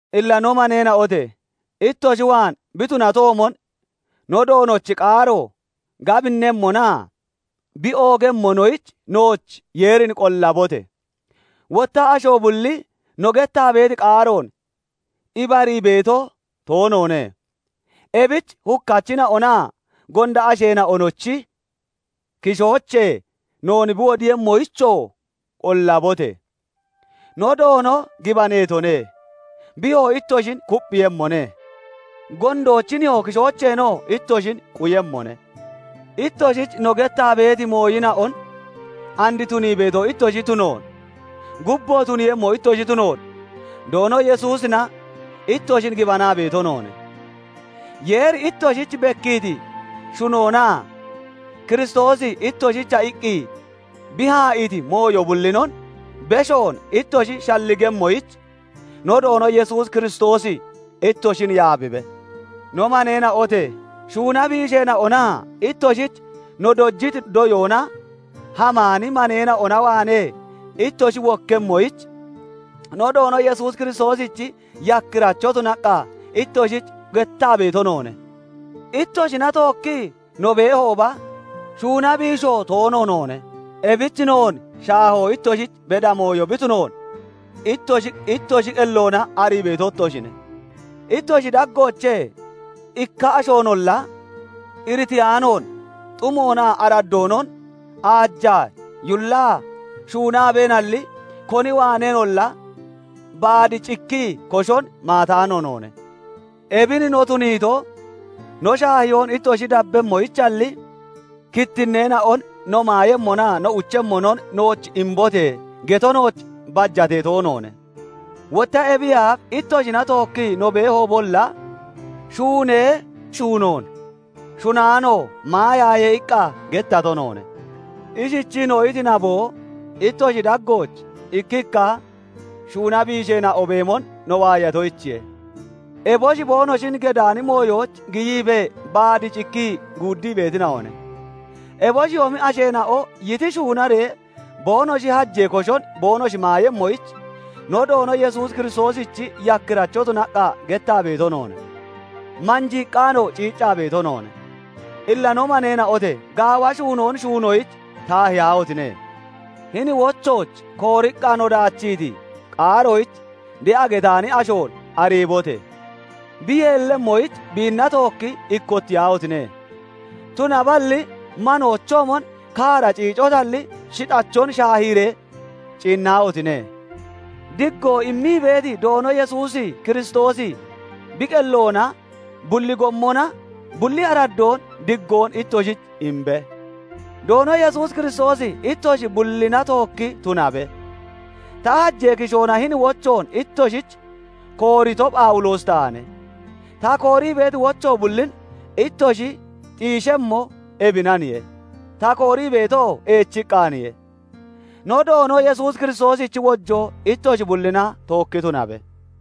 Illa no maneena'ote! Ittoshi waan bi tunatoomon, no Doonochi qaaro gabinnemmonaa bi oogemmonoyich nooch Yeerin qollabote! Wotta asho bulli no gettaa beeti qaaroon ibarii beeto toonoone; ebich hukkachina'onaa gonda asheena'onochi kishoochee noon bi wodiiyemmoyichoo qollabote! No Doono gibaneetone; biyoo ittoshin kupphiiyemmone; gondoochi nihoo kishoocheenoo ittoshin quyemmone. Ittoshich no gettaa beeti mooyina'on and tunii beeto ittoshi tunoon, gubboo tuniiyemmo ittoshi tunoon Doono Yesuusina ittoshin gibanaa beeto noone. Yeeri ittoshich bekkiiti shunoonaa Kiristoosi ittoshicha iqqi bi haa'iiti mooyo bullinon beshoon ittoshi shalligemmoyich, no Doono Yesuus Kiristoosi ittoshin yaabibe. No maneena'ote! Shuuna biisheena'onaa ittoshich no dojiti doyoona hamaani maneena'ona waanee ittoshi wokkemmoyich, no Doono Yesuus Kiristoosichi yakkiracho tunaqqa ittoshich gettaa beeto noone. Ittoshina tookkii no beehooba, shuuna biisho toono noone. Ebich noon shaahoo ittoshich beda mooyo bi tunoon ittoshi ittoshi qelloona arii beeto ittoshine. Ittoshi daggoochee ikka ashoonolla iritiyaanoon xumoonaa araddoonon aajaa yullaa shuunaabeenalli, koni waaneenolla baad cikkii koshon maataano noone. Ebin no tuniito, no shaahiyoon ittoshi dabbemmoyichalli, kittinneena'on "No maayemmonaa no uchemmonon nooch imbote!" geto nooch bajatee toonoone. Wotta ebiyee aaf ittoshina tookkii no beehoobolla, "Shuunee shuunoon shunaano maayaaye" iqqa gettato noone. Ishichii no iti naboo, ittoshi daggooch ikkikka shuuna biisheena'o beemon no waayatoyichiye; eboshi boonoshin gedaani mooyooch giyiibee baad cikkii guuddii beetina'one. Eboshiyoomi asheena'o yiti shuunaree boonoshi hajee koshon boonoshi maayemmoyich, no Doono Yesuus Kiristoosichi yakkiracho tunaqqa gettaa beeto noone; manjiiqqaanoo ciiccaa beeto noone. Illa no maneena'ote! Gaawa shuunoon shuunoyich taahiyaahotine! Hini wochooch kooriqqa no daachiiti qaaroyich de'a getaani ashoon ariibote! Bi yeellemmoyich biinna tookki ikkottiyaahotine! Tunaballi manoochoomon kaara ciicotalli, shixxachon shaahiree ciinnaahotine! Diggoon immii beeti Doono Yesuus Kiristoosi bi qelloona bulli gommona bulli araddoon diggoon ittoshich imbe. Doono Yesuus Kiristoosi ittoshi bullina tookki tunabe. Ta hajee kishoona hini wochoon ittoshich koorito Phawuloosi taane; ta koorii beeti wocho bullin ittoshi xiishemmo ebinaniye; ta koorii beetoo eechiqqaaniye. No Doono Yesuus Kiristoosichi wojoo ittoshi bullina tookki tunabe.